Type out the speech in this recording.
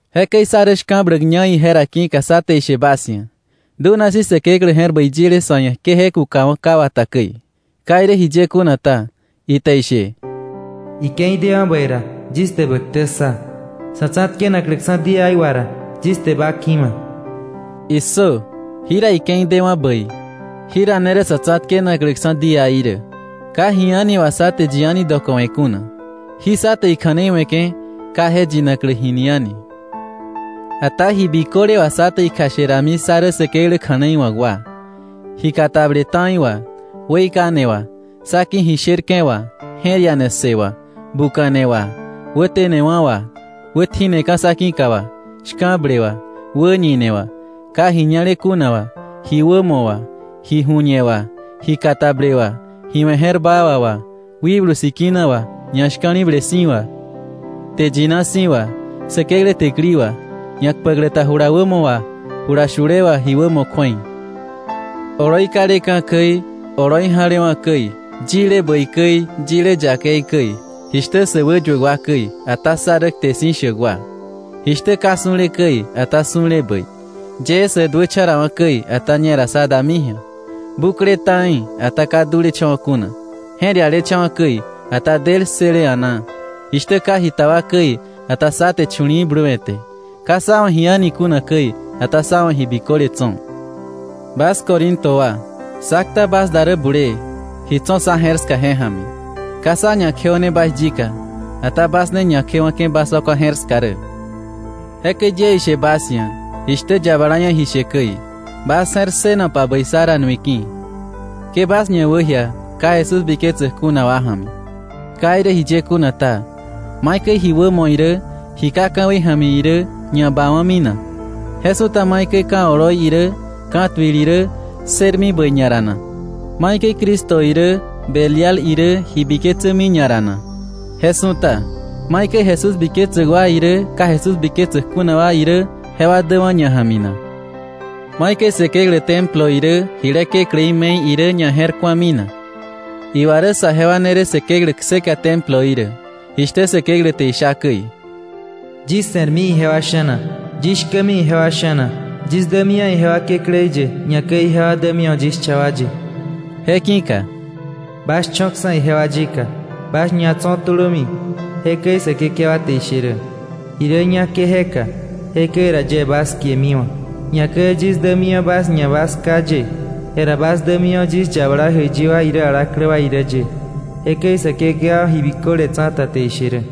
Jekäi sá rä shka̱bläkña ije ra ki̱ka sá te ishe bas ia̱, dunasi̱ Säkeklä je̱r bäi yile sa̱ ia̱ ke je kukawa̱ ka wata käi. Ka irä jiye kuna ta, ite ishe: “Ike̱i dewa̱ bäi ra, yis te ba ktä ssa. Sa̱ tsa̱tkenakläksa̱ díaí wà ra, yis te ba ki̱ma.” ¡Issö! Jira ike̱i dewa̱ bäi, jira ne rä sa̱ tsa̱tkenakläksa̱ díaí rä. Ka ji a̱ni wà sá te yi a̱ni dokowe̱ kuna, jí sá te ikja̱nei we̱ke̱ ka je yinaklä jini a̱ni. Ata ji biköle wà sá te ikjashe rami sá rä Säkeklä kja̱nei wa̱k wa, ji katable ta̱i wà, weikane wà, sá ki̱ ji sherke̱ wà, je̱r ia̱ne ssë wà, buka̱ne wà, wätenewa̱ wà, wätji̱neka̱ sá ki̱ka wà, shka̱ble wà, wäñine wà, ka ji ñale kuna wà, ji wämo wà, ji ju̱ñe wà, ji katable wà, ji we̱ je̱r baa wà wà, Wikblu Sikina wà, ñashka̱li̱ble si̱ wà, kte yina si̱ wà, Säkeklä täkili wà; ñakpäklä ta jula wämo wà jula shule wà ji wämo kju̱ei; oloi kaleka̱ käi, oloi ja̱lewa̱ käi; yile bäi käi, yile yakei käi; jishtä sä wäyuäk wa käi, ata sá rä kte si̱ shäk wa; jishtä ka su̱le käi, ata su̱le bäi; yee sä duächa̱ rawa̱ käi, ata ñera sá dami ji̱a; bukle ta̱i, ata ka dulecha̱wa̱ kuna; je̱r ialecha̱wa̱ käi, ata del ssële a̱naa; jishtä ka jita wa käi, ata sá te chu̱li̱i̱ bluwe̱te; ka sá wa̱ ji a̱ni kuna käi, ata sá wa̱ ji biköle tso̱. Bas Corinto wa, sá kta bas da rä bulee, ji tso̱ sá je̱r ska je ja̱mi. Ka sá ñakjeo̱ne bas yika, ata bas ne ñakjewa̱ke̱ bas wakwa je̱r ska rä. Jekäi yie ishe bas ia̱ jishtä yabala ia̱ ji she käi, bas je̱r ssënopa bäi sá ra nui ki̱. Ke bas ñawäjia ka Jesús biketsäk kuna wa ja̱mi. Ka irä jiye kuna ta, ¿maikäi ji wämo irä, ji ka ka̱wei ja̱mi irä ñabawa̱mi na? Je su̱ta ¿maikäi ka̱ oloi irä, ka̱tuil irä ssërmi bäi ñara na? ¿Maikäi Cristo irä Belial irä ji biketsämi ñara na? Je su̱ta, ¿maikäi Jesús biketsäk wa irä, ka Jesús biketsäk kuna wa irä, jewa däwa̱ ña ja̱mi na? ¿Maikäi Säkeklä templo irä, jile kekläí me̱i irä ña je̱r ku̱ami na? Iwa rä saje wa ne rä Säkeklä kseka temploí rä, jishtä Säkeklä te isha käi: “Yis se̱rmi ijewa sha̱na, yis shkämi ijewa sha̱na, yis dämiwa̱ ijewa Kekläí ye, ñakäi ijewa dämiwa̱ yis cha wa ye.” Je ki̱ka: “Bas cho̱ksa̱ ijewa yika, bas ñatso̱ tulömi. Jekäi Säkekewa te ishe rä. Ji rä ñá ke je ka, jekäi ra yie bas kiemiwa̱, ñakäi yis dämiwa̱ bas ia̱ bas Ká ye, jera bas dämiwa̱ yis yabala jäiyi wa irä alaklä wa irä ye. Jekäi Säkekewa ji biköle tsa̱ta te ishe rä.”